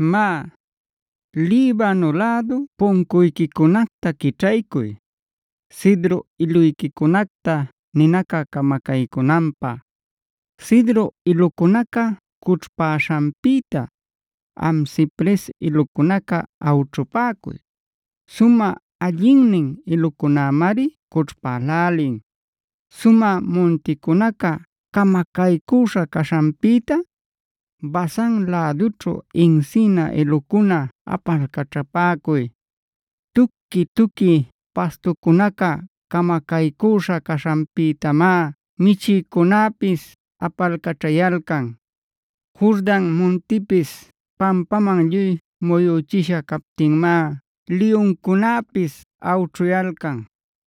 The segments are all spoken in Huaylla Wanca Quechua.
Má, Libano lädu puncuyquicunacta quićhaycuy, cedro iluyquicunacta ninaca camacaycünanpä. Cedro ilucunaca cućhpaśhanpïta, am cipres ilucunaca awćhupäcuy; sumä allinnin ilucunämari cućhpälälin. Sumä munticunaca camacaycüśha caśhanpïta, Basan lädućhu encina ilucuna apalcaćhapäcuy. Tuqui-tuqui pastucunaca camacaycüśha caśhanpïtamá michïcunäpis apalcaćhayalcan. Jordan muntipis pampaman lluy muyüchisha captinmá liyuncunäpis awćhuyalcan.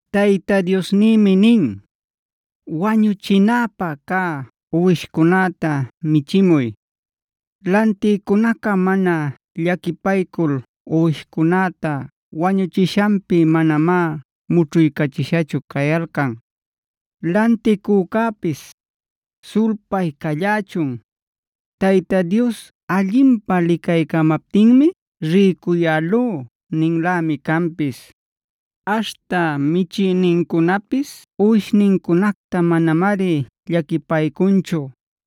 Tayta Diosnïmi nin: “Wañuchinapä cä uwishcunäta michimuy. Lantïcunaca mana llaquipaycul uwishcunäta wañuchishanpi manamá mućhuycachishachu cayalcan. Lanticücäpis: ‘Sulpay callächun, Tayta Dios allinpä licaycamaptinmi rïcuyälú’ ninlämi canpis. Aśhta michïnincunapis uwishnincunacta manamari llaquipaycunchu.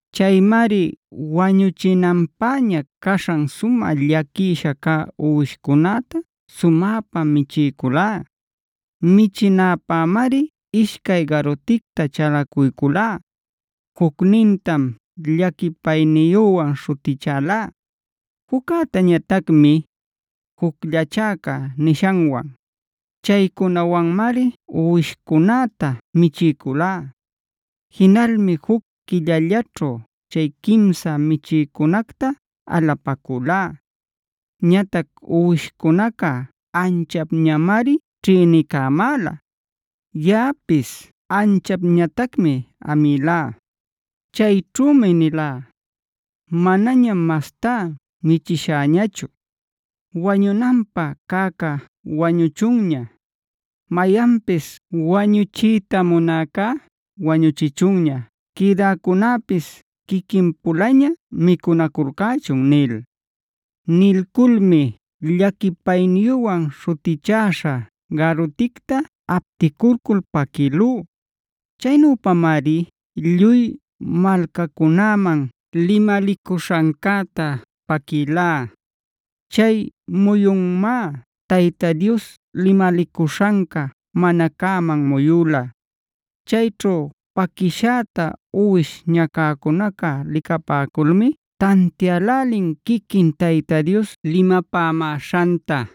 Chaymari wañuchinanpäña caśhan sumä llaquisha cä uwishcunäta sumäpa michiyculá. Michinäpämari ishcay garuticta chalacuyculá: Jucnintam “Llaquipayniyüwan” śhutichalá, juccätañatacmi “Jucllachäca” nishanwan. Chaycunawanmari uwishcunäta michiyculá. Jinalmi juc quillallaćhu chay quimsa michïcunacta alapacülá. Ñatac uwishcunaca anchapñamari ćhïnicamäla, yaꞌapis anchapñatacmi amïlá. Chayćhumi nilá: “Manañam mastá michiśhäñachu. Wañunanpä cäcá wañuchunña. Mayanpis wañuchiyta munäcá wañuchichunña. Quïdäcunäpis quiquin-pulaña micunaculcächun” nil. Nilculmi “Llaquipayniyüwan” śhutichaśhá garuticta aptilcul paquïlú. Chaynüpamari lluy malcacunäman limalicuśhancäta paquïlá. Chay muyunmá Tayta Dios limalicuśhanca mana cäman muyüla. Chayćhu paquishäta uwish ñacäcunaca licapäculmi tantiälälin quiquin Tayta Dios limapämäśhanta.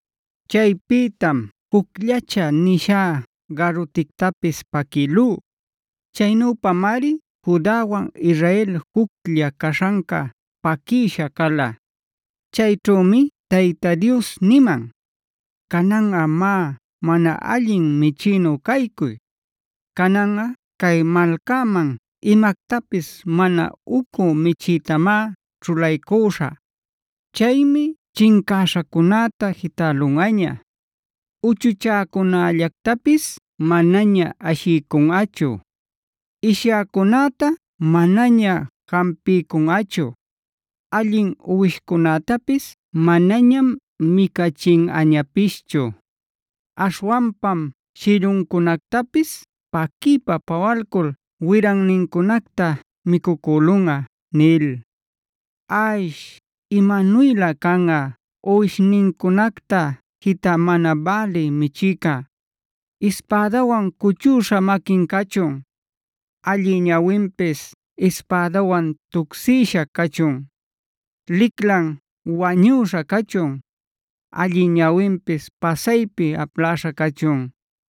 Chaypïtam “Jucllachä” nishá garutictapis paquïlú. Chaynüpamari Judawan Israel juclla caśhanca paquïsha cala. Chayćhümi Tayta Dios niman: “Cananꞌa má, mana allin michïnu caycuy. Cananꞌa cay malcaman imactapis mana ucü michïtamá ćhulaycüśhä. Chaymi chincäśhacunäta jitälunꞌaña, uchuchäcunällactapis manaña ashiycunꞌachu, ishyäcunäta manaña jampiycunꞌachu, allin uwishcunätapis manañam micachinꞌañapischu. Aśhwanpam shilluncunactapis paquiypa pawalcul wirannincunacta micucülunꞌa” nil. ¡Ash imanuylä canꞌa uwishnincunacta jitä mana bälï michïca! ¡Ispädawan cuchüśha maquin cachun! ¡Allï ñawinpis ispädawan tucsïsha cachun! ¡Liclan wañüśha cachun! ¡Allï ñawinpis pasaypi apläśha cachun!